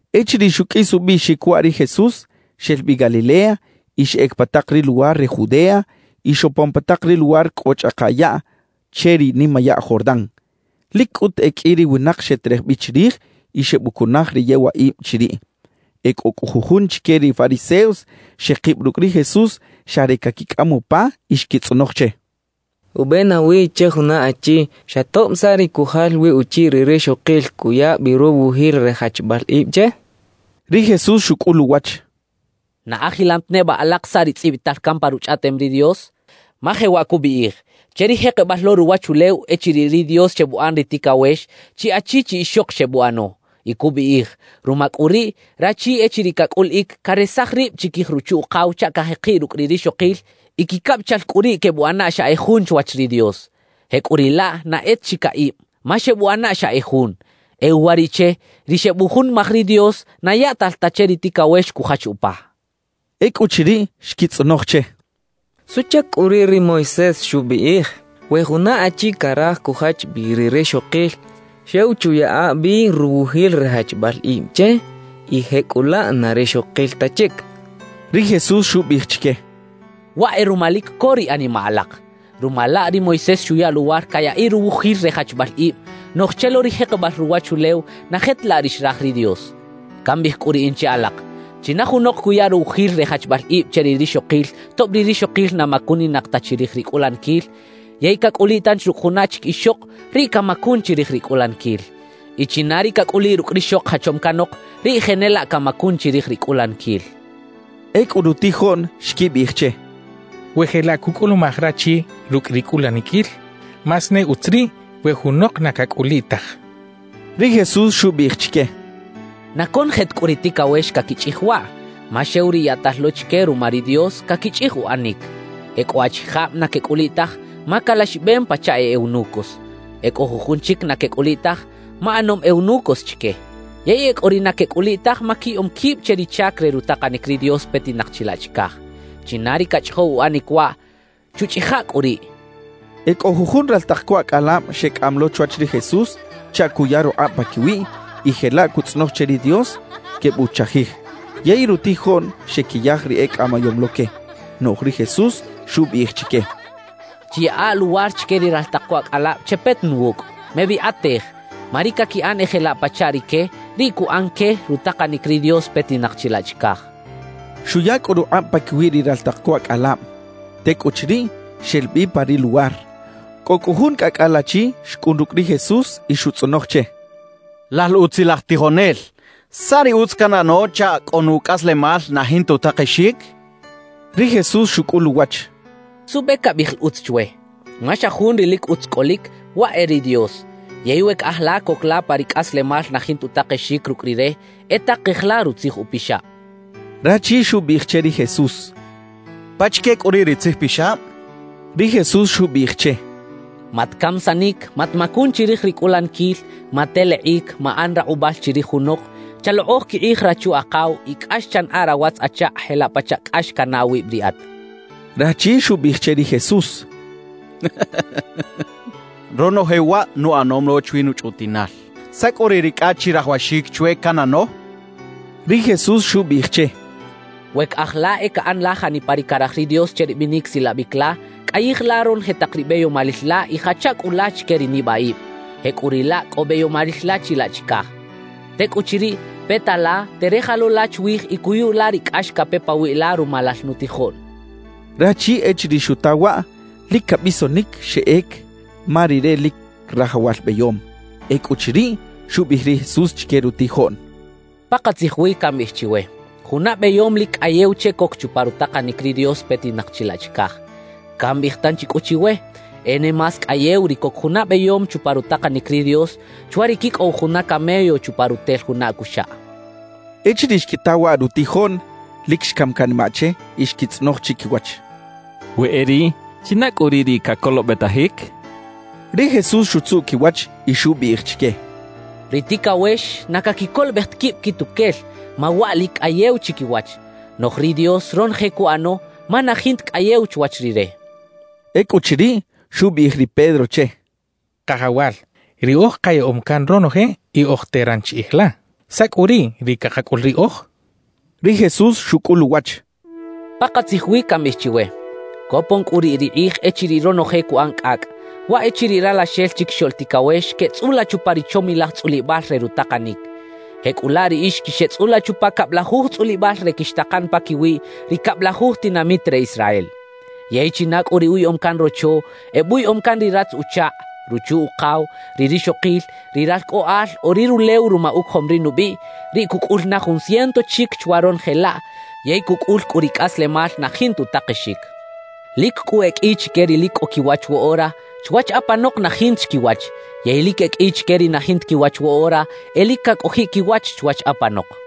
Echiriꞌ xuqꞌuis ubiꞌxic waꞌ ri Jesús, xel bi Galilea y xeꞌec pa tak ri luwar re Judea y xopon pa tak ri luwar cꞌo chꞌaka yaꞌ che ri nimayaꞌ Jordán. Lic cꞌut e qꞌui ri winak xeterej bi chirij y xebucunaj ri yewaꞌib chiriꞌ. E cꞌo cꞌu jujun chique ri fariseos xekib rucꞌ ri Jesús xa re caquicꞌam upa y xquitzꞌonoj che: —¿Ube nawi che juna achi, xa tob saꞌ ri cujal wi uchiꞌ ri rixokil, cuya bi ruwujil re jachbal ib che? —xechaꞌ. Ri Jesús xucꞌul uwach: —¿Na ajilam ta neba alak saꞌ ri tzꞌibital can pa Ruchꞌaꞌtem ri Dios? Ma jewaꞌ cubiꞌij: Che ri jekebal lo ruwachulew echiriꞌ ri Dios xebuꞌan ri ticawex, chi achi chi ixok xebuꞌano. Y cubiꞌij: Ruma cꞌu riꞌ, rachi echiriꞌ cacꞌuliꞌic, caresaj rib chiquij ruchu-ukaw chaꞌ cajekiꞌ rucꞌ ri rixokil y quicabichal cꞌu riꞌ quebuꞌana xa e jun chwach ri Dios. Jecꞌuriꞌlaꞌ na e ta chi caꞌib, ma xebuꞌana xa e jun. E uwariꞌche, ri xebujunimaj ri Dios, na yaꞌtal ta che ri ticawex cujach upa —xchaꞌ. Ecꞌuchiriꞌ, xquitzꞌonoj che: —¿Suꞌchac cꞌu riꞌ ri Moisés xubiꞌij we juna achi caraj cujach bi ri rixokil, xew chuyaꞌa bi ruwujil re jachbal ib che y jecꞌulaꞌ na rixokil ta chic? —xechaꞌ. Ri Jesús xubiꞌij chique: —Waꞌ e ruma lic co ri animaꞌ alak. Ruma laꞌ ri Moisés xuya luwar cayaꞌiꞌ ruwujil re jachbal ib; noꞌj che lo ri jekebal ruwachulew na je ta laꞌ ri xraj ri Dios. Cambiꞌij cꞌu riꞌin che alak: China junok cuya ruwujil re jachbal ib che ri rixokil tob ri rixokil na macuninak ta chirij ri cꞌulaniquil, yey cacꞌuliꞌ tanchi rucꞌ juna chic ixok, riꞌ camacun chirij ri cꞌulaniquil. Y china ri cacꞌuliꞌ rucꞌ rixok jachom canok, riꞌ jenelaꞌ camacun chirij ri cꞌulaniquil —xchaꞌ. Ecꞌu rutijoꞌn xquibiꞌij che: —We jelaꞌ cucꞌulumaj rachi rucꞌ ri cꞌulaniquil, más ne utz riꞌ we junok na cacꞌuliꞌ taj —xechaꞌ. Ri Jesús xubiꞌij chique: —Na conoje ta cꞌu ri ticawex caquichꞌij waꞌ; ma xew ri yaꞌtal lo chique ruma ri Dios, caquichꞌij uꞌanic. E cꞌo achijab na quecꞌuliꞌ taj ma calaxibem pachaꞌ e eunucos. E cꞌo jujun chic na quecꞌuliꞌ taj ma ꞌanom eunucos chique. Yey e cꞌo ri na quecꞌuliꞌ taj ma quiyaꞌom quib che ri chac re rutakanic ri Dios petinak chilaꞌ chicaj. China ri cachꞌijow uꞌanic waꞌ, chuchꞌija cꞌu riꞌ —xchaꞌ. E cꞌo jujun raltak co acꞌalab xecꞌam lo chwach ri Jesús chaꞌ cuya rukꞌab paquiwiꞌ y jelaꞌ cutzꞌonoj che ri Dios quebuchajij. Yey rutijoꞌn xequiyaj ri ecꞌamayom lo que. Noꞌj ri Jesús xubiꞌij chique: «Chiyaꞌa luwar chique ri raltak co acꞌalab chepeta na wucꞌ. Mebikꞌatej; ma ri caquiꞌan e jelaꞌ pachaꞌ rique, riꞌ cuꞌan que rutakanic ri Dios petinak chilaꞌ chicaj» xchaꞌ. Xuya cꞌu rukꞌab paquiwi ri raltak co acꞌalab. Tecꞌuchiriꞌ, xel bi pa ri luwar. Cꞌo cꞌu jun cꞌacꞌal achi xcꞌun rucꞌ ri Jesús y xutzꞌonoj che: —Lal utzilaj tijonel, ¿saꞌ ri utz canꞌano chaꞌ cꞌo nucꞌaslemal na jinta utakexic? —xchaꞌ. Ri Jesús xucꞌul uwach: —¿Suꞌbe cabiꞌij la “utz” chwe? Ma xa jun ri lic utz cꞌolic, waꞌ e ri Dios. Yey we caꞌaj la coc la pa ri cꞌaslemal na jinta utakexic rucꞌ Rire, e takej la Rutzij Upixab —xchaꞌ. Rachi xubiꞌij che ri Jesús: —¿Pachique cꞌu riꞌ ri tzijpixab? —xchaꞌ. Ri Jesús xubiꞌij che: —“Matcamisanic. Matmacun chirij ri cꞌulaniquil. Matelekꞌic. Maꞌan rakꞌubal chirij junok. Chalokꞌoj quikꞌij rachu-akaw” y “Cꞌax chanaꞌa rawatz-achakꞌ jelaꞌ pachaꞌ cꞌax canaꞌ awib riꞌat” —xchaꞌ. Rachi xubiꞌij che ri Jesús: —Ronoje waꞌ nuꞌanom lo chwi nuchꞌutiꞌnal. ¿Saꞌ cꞌu riꞌ ri cꞌa chirajawaxic chwe canꞌano? —xchaꞌ. Ri Jesús xubiꞌij che: —We caꞌaj la e caꞌan la janipa ri caraj ri Dios che ri binic silabic la, cꞌayij la ronoje tak ri beyomalil la y jacha cꞌu la chique ri nibaꞌib; jecꞌuriꞌlaꞌ cꞌo beyomalil la chilaꞌ chicaj. Tecꞌuchiriꞌ, peta la, terej lo la chwij y cuyu la ri cꞌax cape pawiꞌ la ruma lal nutijoꞌn —xcha che. Rachi echiriꞌ xuta waꞌ, lic cabisonic xeꞌec ma rire lic rajawal beyom. Ecꞌuchiriꞌ, xubiꞌij ri Jesús chique rutijoꞌn: —Pakatzij wi cambiꞌij chiwe: Juna beyom lic cꞌayew che coc chupa rutakanic ri Dios petinak chilaꞌ chicaj. Cambiꞌij tanchi cꞌu chiwe: E ne más cꞌayew ri coc juna beyom chupa rutakanic ri Dios chwa ri quicꞌow juna camello chupa rutel juna acuxaꞌ —xchaꞌ. Echiriꞌ xquita waꞌ rutijoꞌn, lic xcam canimaꞌ che y xquitzꞌonoj chiquiwach: —We e riꞌ, ¿china cꞌu riꞌ ri cacolobetajic? —xechaꞌ. Ri Jesús xutzuꞌ quiwach y xubiꞌij chique: —Ri ticawex na caquicolobej ta quib quituquel ma waꞌ lic cꞌayew chiquiwach; noꞌj ri Dios ronoje cuꞌano ma na jinta cꞌayew chwach Rire —xchaꞌ. Ecꞌuchiriꞌ, xubiꞌij ri Pedro che: —Kajawal, riꞌoj kayaꞌom can ronoje y oj teran chiꞌij la. ¿Saꞌ cꞌu riꞌ ri cakacꞌul riꞌoj? —xchaꞌ. Ri Jesús xucꞌul uwach: —Pakatzij wi cambiꞌij chiwe: Copon cꞌu riꞌ ri kꞌij echiriꞌ ronoje cuꞌan cꞌacꞌ, waꞌ echiriꞌ Ralaxel Chiquixoꞌl Ticawex queꞌtzꞌula chupa ri chomilaj tzꞌulibal re rutakanic. Jecꞌulaꞌ riꞌix quixeꞌtzꞌula chupa cablajuj tzꞌulibal re quixtakan paquiwi ri cablajuj tinamit re Israel. Yey china cꞌu ri uyaꞌom can rocho, ebuyaꞌom can ri ratz-uchakꞌ, ruchu-ukaw, ri rixokil, ri ralcꞌoꞌal o ri rulew ruma ucojom ri nubiꞌ, riꞌ cucꞌul na jun ciento chic chwa ronoje laꞌ yey cucꞌul cꞌu ri cꞌaslemal na jinta utakexic. »Lic cꞌu e qꞌui chique ri lic cꞌo quiwach woꞌora, chwach apanok na jinta chi quiwach; yey lic e qꞌui chique ri na jinta quiwach woꞌora, e lic cacꞌojiꞌ quiwach chwach apanok.